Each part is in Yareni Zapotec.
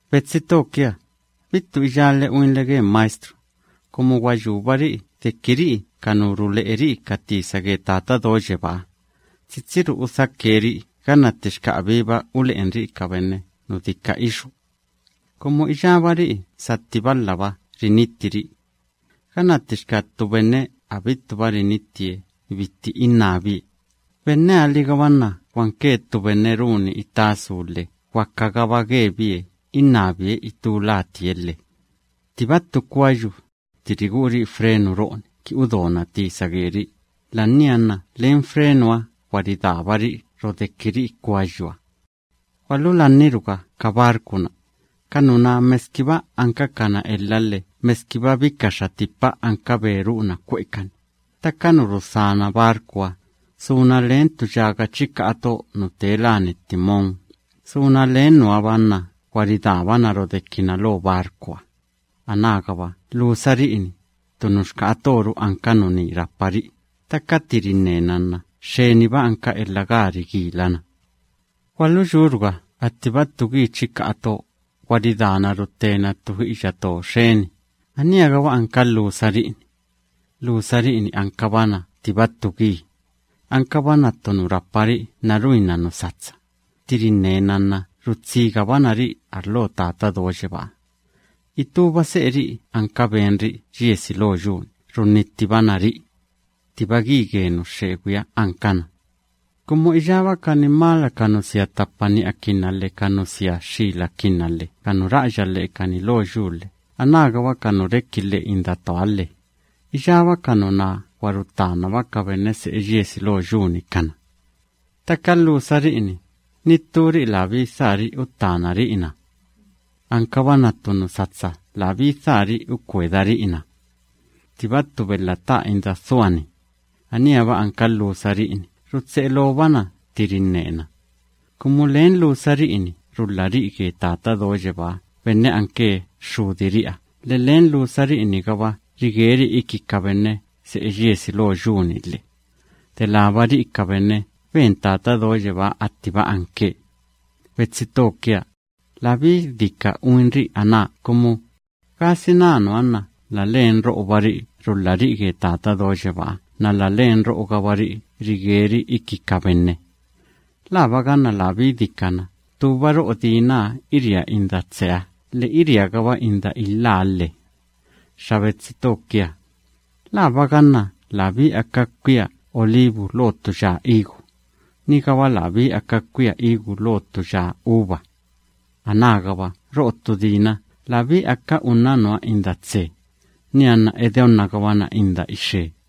Betsi to kia, bittu iyále uinle ge maestru, kumu gwa yúbari'i deki ri'i ka nu rule'eri'i ka tisa ge Tata Do Yebáha, tsitsiru udhake ri'i ganna ttixka abíba ule'enri'i ka benne nu dika ixú. Kumu iyábari'i satti balhaba rinittiri'i. Ganna ttixka ttu benne abittuba rinittie bitti innábie, benneha‑ligaba nna gwanke ttu benne runi itá su lhe gwakagaba gebie innabie itú latie lhe. Ttiba ttu kwayu, tti rigu'uri'i frenu ro'oni ki udona tisa geri'i, la'ania nna len frenuha gwa ridábari'i rodekiri'i kwayuha. Gwalulanniruga ka barcu‑na. Ka nuná meskiba ankakana elha lhe meskiba bikaxa tipa anka be ru'una kwe'ekani, ttaka nu rudhána barcuha, suna len ttu yaga chika'a to nu tee láni timón, suna len nuha‑ba nna gwa ridábana rodekina lo barcuha. Anágaba lhusari'i‑ni, ttu nuxka'a toru anka nuní rapari'i, ttaka tti rinnena nna xxeniba anka elha gaa rigilana. Gwaluyúruga attiba ttu gi chika'a to, gwa ridaana ruttena ttu i'iyatoo xeni, aníha‑gaba anka lhusari'i‑ni. Lhusari'i‑ni ankabana ttiba ttu gi. Ankabana ttu nu rapari'i nna ruinna nu satsa; tti rinnena nna rutsigabana ri'i arlo Tata Do Yebáha. Itúba se'eri'i anka benri'i yiesi lo yu‑ni runnittibana ri'i. Ttiba gi ge nu xxegwiha ankana. Kumu iyába ka nimala ka nu sia ttapa ni'akinna lhe ka nu sia xxilakinna lhe ka nu ra'aya lhe'ekani lo yu lhe anágaba ka nu reki lhe'e indatooha lhe, iyába ka nuná gwa ruttanaba ka benne se'e yiesi lo yu‑ni kana. Ttaka lhusari'i‑ni, ni ttúri'i labí dhaari'i uttánari'i na. Ankabana ttu nu satsa labí dhaari'i ukwedari'i na. Ttiba ttu belha ta'a inda dhua‑ni, aníha‑ba anka lhusari'i‑ni rutse'e loobana tti rinnena, kumu len lhusari'i‑ni rulhari'i ge Tata Do Yebáha benne anke Xxudiri'iha lhe len lhusari'i‑nigaba rigeri'i iki ka benne se'e yiesi lo yu‑ni lhe, delába ri'i ka benne ben Tata Do Yebáha attiba anke. Betsi to kia, labí dika uinri'i aná kumu, ¿gasina nuha nna la len ro'obari'i rulhari'i ge Tata Do Yebáha nna la len ro'ogabari'i rigeri'i iki ka benne? ¿Laaba ganna labí dikana ttúba ro'o dinaha iria inda tseha lhe iriagaba inda ilháha lhe? Xa betsi to kia, ¿laaba ganna labí aka kwia olivu lo ttu ya higu, nigaba labí aka kwia higu lo ttu ya uva? Anágaba ro'o ttu dina labí aka unna nuha inda tse, nianna edeonnagabana inda ixe.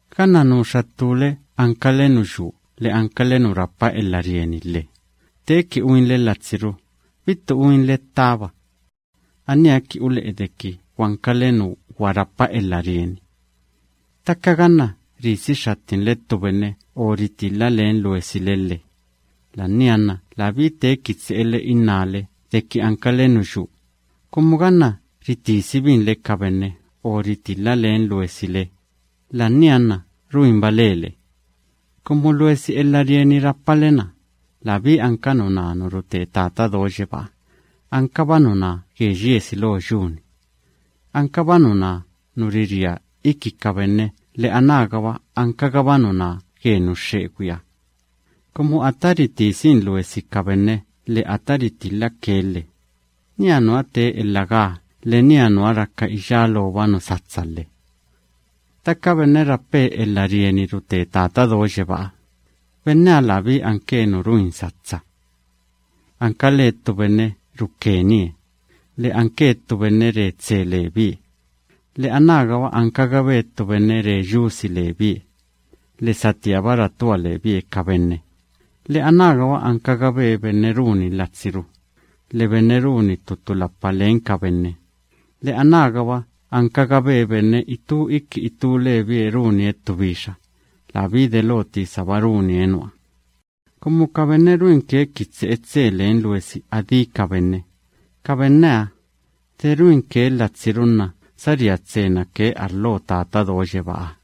Ganna nuxa ttúle ankale nu yuu lhe ankale nu rapa elha rieni lhe, teeki uinle latsiru, bittu uinle ttaba. Aníha kini ule'e deki gwankale nu gwa rapa elha rieni. Ttaka ganna risi xxattinle ttu benne o ritilha len luesile lhe, la'ania nna labí teeki tse'ele innále deki ankale nu yuu, kumu ganna ritisibinle ka benne o ritilha len luesile, la'ania nna ruinba lele. Kumu luesi elha rieni rapale‑na, labí anka nuná nu rute Tata Do Yebáha, ankaba nuná ge yiesi lo yu‑ni. Ankaba nuná nu riria iki ka benne lhe anágaba ankagaba nuná ge nu xxegwiha. Kumu ata ritisin luesi ka benne lhe ata ritilhake lhe, niha nuha tee elha gaa lhe niha nuha raka iyá looba nu satsa lhe. Ttaka benne rape elha rieni rute Tata Do Yebáha, benneha labí anke nu ruin satsa. Ankalee ttu benne rukenie lhe anke ttu benne re tse lebie lhe anágaba ankagabe ttu benne re yusi lebie lhe satíaba ratua lebie ka benne lhe anágaba ankagabe benne runi latsiru lhe benne runi tu tulapa len ka benne lhe anágaba ankagabe benne itú iki itú lebie runie ttu bixa, labí delo tisaba runie nuha. Kumu ka benne ruinke kini tse'e tse len luesi adí ka benne, ka benneha, de ruinke latsiru nna saría tsena ke arlo Tata Do Yebáha.